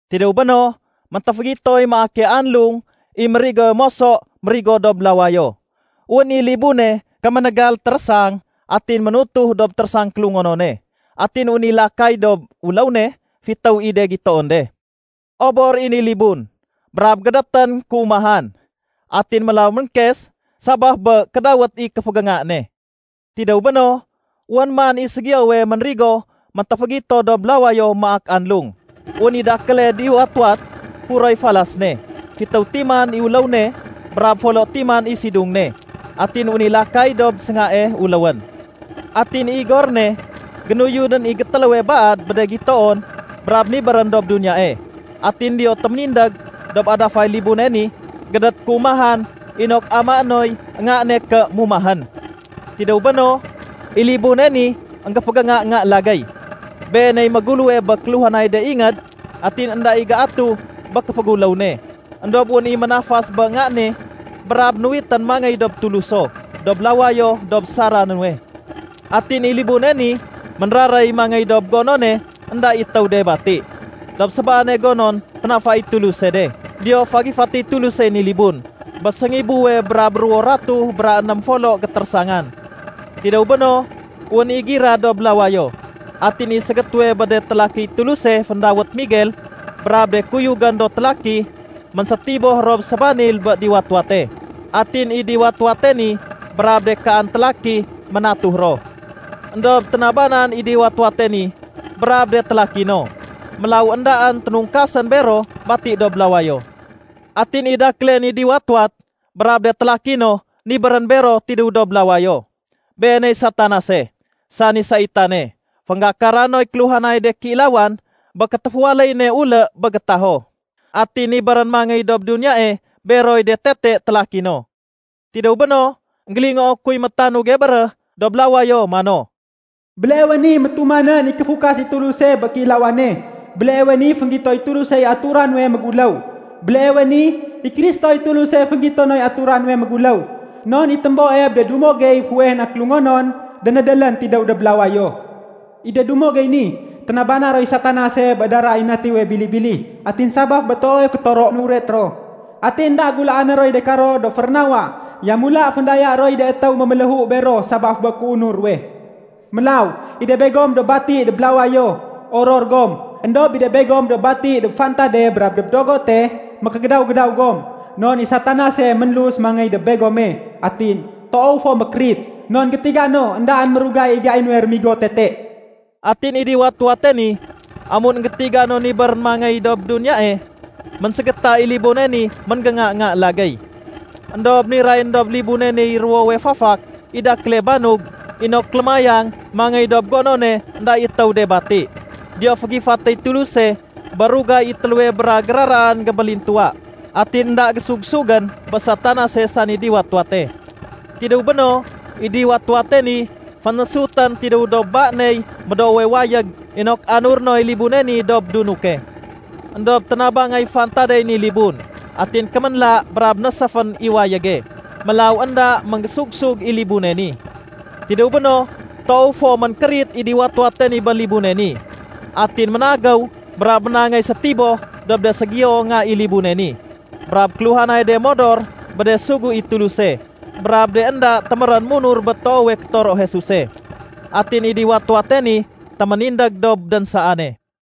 Tidéw béno, méntéfégitoy maake anlung i mérigowe moso mérigo dob lawayo. Wén i libune kéménégal térésang, atin ménutuh dob térésang kélungonone. Atin wén i lakay dob uléw ne fitéw i de gitoon de. Obor i ni libun brab gédétén kéumahan. Atin mélaw ménkes sabaf bé kédawét i kéfégénga ne. Tidéw béno, wén man i ségiyowe ménrigo méntéfégito dob lawayo maak anlung. Wén i dakéle diwat-wat furoy falas ne. Fitéw timan i uléw ne brab folo timan i sidung ne. Atin wén i lakay dob séngae uléwén. Atin i igor ne génuyudén i gétéléwe baad bé de gitoon brab nibérén dob duniyae. Atin diyo téménindég dob adafay libune ni gédét kéumahan inok amaé noy nga ne ké mumahén. Tidéw béno, i libune ni énggéfégénga nga lagéy. Beeney méguléwe bé kéluhanay de ingéd atin énda i géatuh bé kéféguléw ne. Endob wén i ménafas bé ngae ni brab nuwitén mangéy dob Tuluso dob lawayo dob sara nuwe. Atin i libune ni ménraréy mangéy dob gonone énda i étéw de bati, dob sébaane gonon ténafay i Tuluse de. Diyo fagifatéy Tulusey ni libun bé séngibuwe brab ruwo ratuh bra ném folo gétérésangan. Tidéw béno, wén i gira dob lawayo. Atin i ségétéwe bé de télakiy Tuluse féndawét Miguel brab de kuyugén do télaki, ménsétiboh ro sébanil bé diwat-wate. Atin i diwat-wate ni brab de kaan télaki, ménatuh ro. Endob ténabanan i diwat-wate ni brab de télaki no. Mélaw éndaén ténungkasén bero bati dob lawayo. Atin i dakéle ni diwat-wat brab de télaki no nibérén bero tidéw dob lawayo. Beeney Satanase, sani saitane fénggakara noy kéluhanay de kéilawan bé kétéféwaléy ne ulé bé gétaho. Atin nibérén mangéy dob duniyae beroy de tete télaki no. Tidéw béno, énggélingoo kuy métanuge béréh dob lawayo mano, “Béleewe ni métumanén i kéfukas i Tuluse bé kéilawane. Béleewe ni fénggitoy Tulusey atura nuwe méguléw. Béleewe ni, i Kristoy Tuluse fénggito noy atura nuwe méguléw. Non i témboe bé de dumo gey fuweh na kélungonon, dénédélén tidéw dob lawayo. I de dumo gey ni, ténabana roy Satanase bé dara i Natiwe Bili-bili, atin sabaf bé toowe kétoro nuret ro. Atin énda gulaané roy de karo do férénawa, yamula féndaya roy de étéw méméléhu bero sabaf bé kéunur ruwe. Mélaw, i de begom do bati dob lawayo, oror gom. Endob i de begom do bati dob fantade brab dob dogote, mékégédaw-gédaw gom. Non i Satanase ménlus mangéy dob begome. Atin toow fo mékérit, non gétiga no éndaén mérugay i gai nuwe rémigo tete.” Atin i diwat-wate ni, amun énggétiga no nibérén mangéy dob duniyae, ménségéta i libune ni ménggénga nga lagéy. Endob nirayén dob libune niy ruwowe fafak i dakéle banug inok lémayang mangéy dob gonone énda i étéw de bati. Diyo fégifatéy Tuluse bé rugay i téléwe bra géraraan gébélintuwa. Atin énda gésugsugén bé Satanase sani diwat-wate. Tidéw béno, i diwat-wate ni fénésutén tidéw dob ba ney médoowe wayég inok anuré noy libune ni dob dunuke. Endob ténabangay fantadey ni libun atin kéménla brab néséfén i wayége. Mélaw énda ménggésug-sug i libune ni. Tidéw béno, toow fo ménkérit i diwat-wate ni bé libune ni. Atin ménagéw brab ménangéy sétiboh dob de ségiyo nga i libune ni brab kéluhanay de modor bé de sugu i Tuluse brab de énda témérén munur bé toowe kétoro Jesuse. Atin i diwat-wate ni téménindég dob dénsaane.